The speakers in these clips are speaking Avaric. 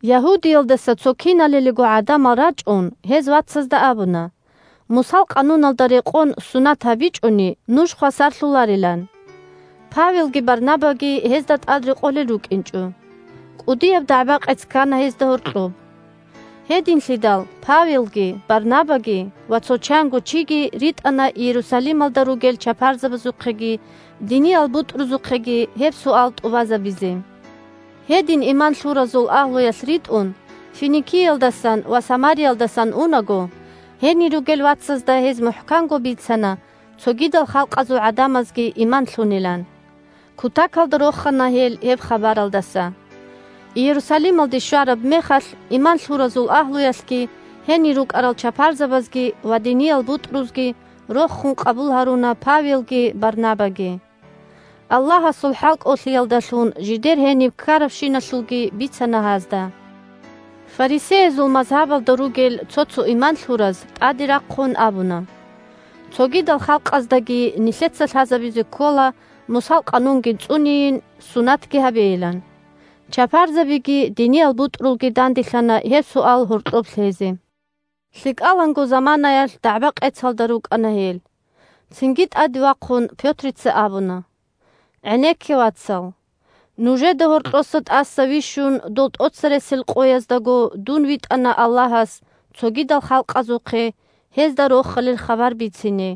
Ягьудиялдаса цо киналалиго гӀадамал рачӀун гьез вацазда абуна, Мусал къануналда рекъон сунат гьабичӀони, нуж хвасарлъуларилан. Павелги Барнабаги гьезда тӀадрекъолел рукӀинчӀо. КӀудияб дагӀба-къец ккана гьезда гьоркьоб. Гьединлъидал Павелги, Барнабаги ва цо чанго чиги ритӀана Иерусалималда ругел чапарзабазухъеги диниял бутӀрузухъеги гьеб суал тӀубазабизе. Гьедин иман лъуразул агьлуялъ ритӀун, Финикиялдасан ва Самариялдасан унаго, гьенир ругел вацазда гьез мухӀканго бицана цогидал халкъазул гӀадамазги иман лъунилан. Кутакалда рохана гьел гьеб хабаралдаса. Иерусалималде щвараб мехалъ иман лъуразул агьлуялъги, гьенир рукӀарал чапарзабазги ва диниял бутӀрузги рохун къабул гьаруна Павелги Барнабаги. Аллагьасул хӀалкӀолъиялдалъун жидер гьениб ккарабщиналъулги бицана гьазда. Фарисеязул мазгьабалда ругел цо-цо иман лъураз, тӀаде рахъун, абуна: – Цогидал халкъаздаги нилъеца лъазабизе ккола Мусал къанунги цӀунейин, сунатги гьабейилан. Чапарзабиги диниял бутӀрулги данделъана гьеб суал гьоркьоб лъезе. ЛъикӀаланго заманаялъ дагӀба-къецалда рукӀана гьел. Цинги, тӀаде вахъун, Пётрица абуна: – ГӀенекке, вацал! Нужеда гьоркьоса тӀаса вищун, дол тӀоцересел къояздаго дун витӀана Аллагьас цогидал халкъазухъе гьезда Рохалил хабар бицине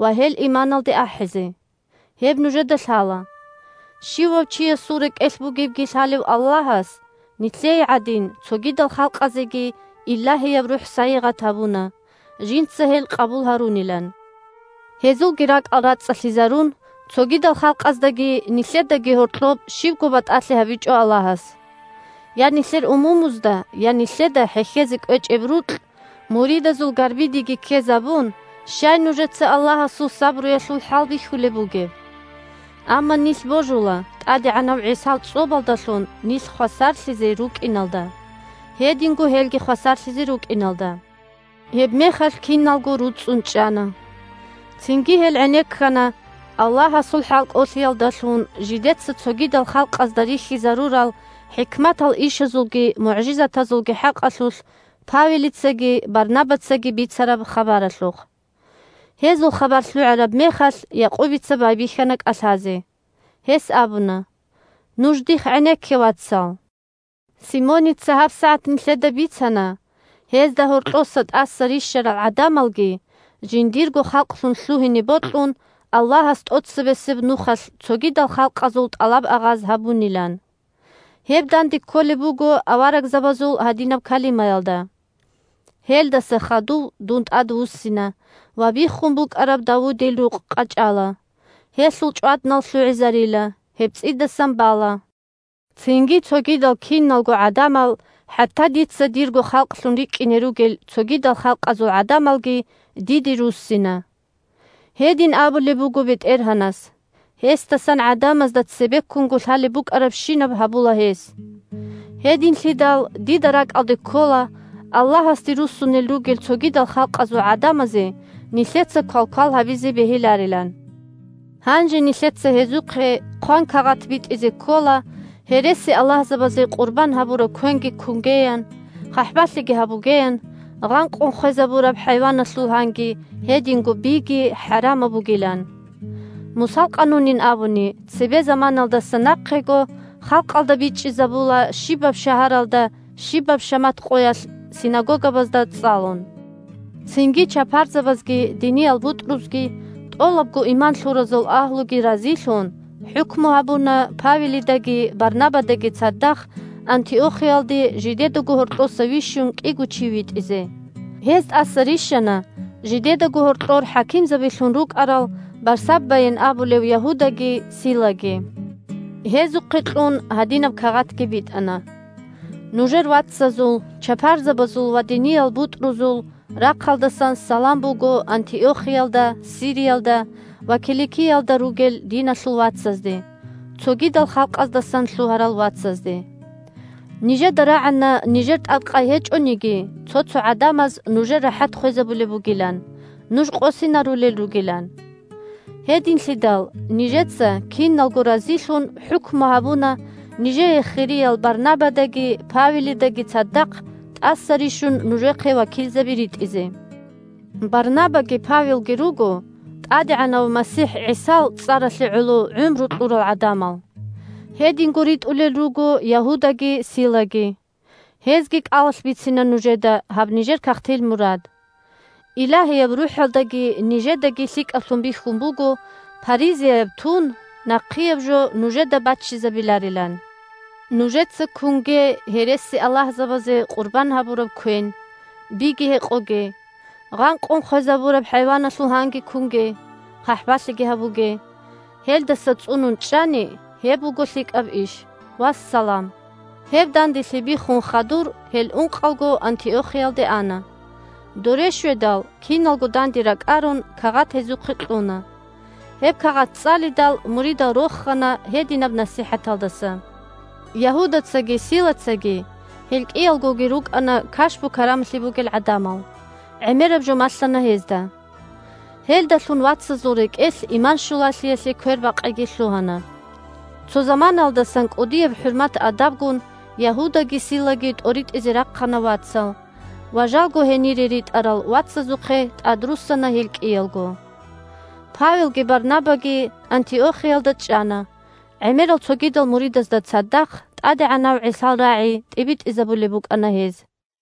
ва гьел иманалде ахӀизе. Гьеб нужеда лъала. Щивав чиясул рекӀелъ бугебги лъалев Аллагьас, нилъее гӀадин, цогидал халкъазеги Илагьияб РухӀ сайигъат гьабуна, жинца гьел къабул гьарунилан. Гьезулги ракӀал рацӀцӀалъизарун, цогидал халкъаздаги нилъедаги гьоркьоб щибго батӀалъи гьабичӀо Аллагьас. Я нилъер умумузда, я нилъеда хӀехьезе кӀвечӀеб рукь муридазул гарбидеги ккезабун, щай нужеца Аллагьасул сабруялъул хӀалбихьулеб бугеб? Амма нилъ божула ТӀадегӀанав ГӀисал цӀобалдалъун нилъ хвасарлъизе рукӀиналда, гьединго гьелги хвасарлъизе рукӀиналда. Гьебмехалъ киналго руцӀцӀун чӀана. Цинги гьел гӀенеккана Аллагьасул хӀалкӀолъиялдалъун жидеца цогидал халкъазда рихьизарурал хӀикматал ишазулги мугӀжизатазулги хӀакъалъулъ Павелицаги Барнабацаги бицараб хабаралъухъ. Гьезул хабар лъугӀараб мехалъ, Якъубица байбихьана кӀалъазе. Гьес абуна: – Нуж дихъ гӀенекке, вацал! Симоница гьабсагӀат нилъеда бицана, гьезда гьоркьоса тӀаса рищарал гӀадамалги жиндирго халкълъун лъугьине бокьун, Аллагьас тӀоцебесеб нухалъ цогидал халкъазул тӀалаб-агъаз гьабунилан. Гьеб данде кколеб буго аварагзабазул гьадинаб калимаялда: «Гьелдаса хадув Дун тӀадвуссина ва биххун букӀараб Давудил рукъ къачӀала, гьелъул чӀваднал лъугӀизарила, гьеб цӀидасан бала. Цинги цогидал киналго гӀадамал, хӀатта Дица дирго халкълъун рикӀкӀине ругел цогидал халкъазул гӀадамалги, Диде руссина». Гьедин абулеб буго БетӀергьанас, гьесдасан гӀадамазда цебеккунго лъалеб букӀарабщинаб гьабула гьес. Гьединлъидал дида ракӀалде ккола Аллагьасде руссунел ругел цогидал халкъазул гӀадамазе нилъеца квалквал гьабизе бегьиларилан. Гьанже нилъеца гьезухъе хъван кагъат битӀизе ккола гьересиаллагьзабазе къурбан гьабураб квенги кунгеян, хъахӀбалъиги гьабугеян, гъанкъун хвезабураб хӀайваналъул гьанги, гьединго биги хӀарамаб бугилан. Мусал къанунин абуни, цебе заманаялдаса нахъего халкъалда бичӀчӀизабула щибаб шагьаралда щибаб шамат къоялъ синагогабазда цӀалун. Цинги чапарзабазги диниял бутӀрузги, тӀолабго иман лъуразул агьлуги разилъун, хӀукму гьабуна Павелидаги Барнабадаги цадахъ Антиохиялде, жидедаго гьоркьоса вищун, кӀиго чи витӀизе. Гьез тӀаса рищана жидедаго гьоркьор хӀакимзабилъун рукӀарал Барсаббайин абулев Ягьудаги Силаги. Гьезухъе кьун, гьадинаб кагъатги битӀана: «Нужер вацазул – чапарзабазул ва диниял бутӀрузул – рахъалдасан салам буго Антиохиялда, Сириялда ва Киликиялда ругел диналъул вацазде – цогидал халкъаздасан лъугьарал вацазде. Нижеда рагӀана нижер тӀадкъай гьечӀониги цо-цо гӀадамаз нужер рахӀат хвезабулеб бугилан, нуж къосинарулел ругилан. Гьединлъидал нижеца, киналго разилъун, хӀукму гьабуна нижее хириял Барнабадаги Павелидаги цадахъ тӀаса рищун нужехъе вакилзаби ритӀизе. Барнабаги Павелги руго ТӀадегӀанав МасихӀ ГӀисал цӀаралъе гӀоло гӀумру кьурал гӀадамал. Гьединго ритӀулел руго Ягьудаги Силаги. Гьезги кӀалалъ бицина нужеда гьаб нижер кагътил мурад. Илагьияб РухӀалдаги нижедаги лъикӀаблъун бихьун буго – паризаяб тун нахъияб жо нужеда баччизабиларилан. Нужеца кунге гьересиаллагьзабазе къурбан гьабураб квен, биги гьекъоге, гъанкъун хвезабураб хӀайваналъул гьанги кунге, хъахӀбалъиги гьабуге. Гьелдаса цӀунун чӀани, – гьеб буго лъикӀаб иш. Вассалам». Гьеб данделъи биххун хадур гьел ункъалго Антиохиялде ана. Доре щведал, киналго данде ракӀарун, кагъат гьезухъе кьуна. Гьеб кагъат цӀалидал, муридал рохана гьединаб насихӀаталдаса. Ягьудацаги Силацаги (гьел кӀиялгоги рукӀана кашпу-карамалъи бугел гӀадамал) гӀемераб жо малъана гьезда. Гьелдалъун вацазул рекӀелъ иман щулалъиялъе квербакъиги лъугьана. Цо заманаялдасан кӀудияб хӀурмат-адабгун Ягьудаги Силаги тӀоритӀизе рахъана вацал, ва жалго гьенире ритӀарал вацазухъе тӀадруссана гьел кӀиялго. Павелги Барнабаги Антиохиялда чӀана, гӀемерал цогидал муридазда цадахъ ТӀадегӀанав ГӀисал рагӀи тӀибитӀизабулеб букӀана гьез.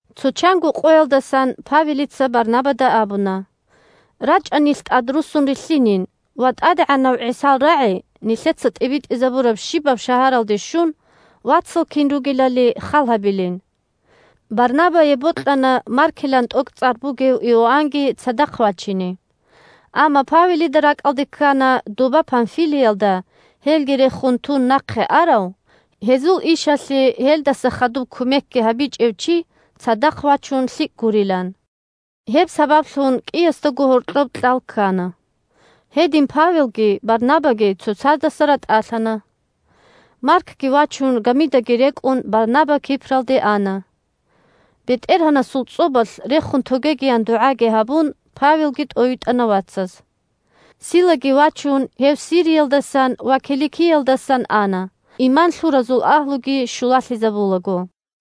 Цо чанго къоялдасан Павелица Барнабада абуна: – РачӀа нилъ тӀадруссун рилълъинин ва, ТӀадегӀанав ГӀисал рагӀи нилъеца тӀибитӀизабураб щибаб шагьаралде щун, вацал кин ругелали хал гьабилин. Барнабае бокьана Маркилан тӀокӀцӀар бугев Иоаннги цадахъ вачине. Амма Павелида ракӀалде ккана доба, Памфилиялда, гьелги рехун тун нахъе арав, гьезул ишалъе гьелдаса хадуб кумекги гьабичӀев чи цадахъ вачун лъикӀ гурилан. Гьеб сабаблъун кӀиясдаго гьоркьоб кьал ккана. Гьедин Павелги Барнабаги цоцаздаса ратӀалъана. Маркги вачун, гамидаги рекӀун, Барнаба Кипралде ана. БетӀергьанасул цӀобалъ рехун тогегиян дугӀаги гьабун, Павелги тӀовитӀана вацаз. Силаги вачун, гьев Сириялдасан ва Киликиялдасан ана, иман лъуразул агьлуги щулалъизабулаго.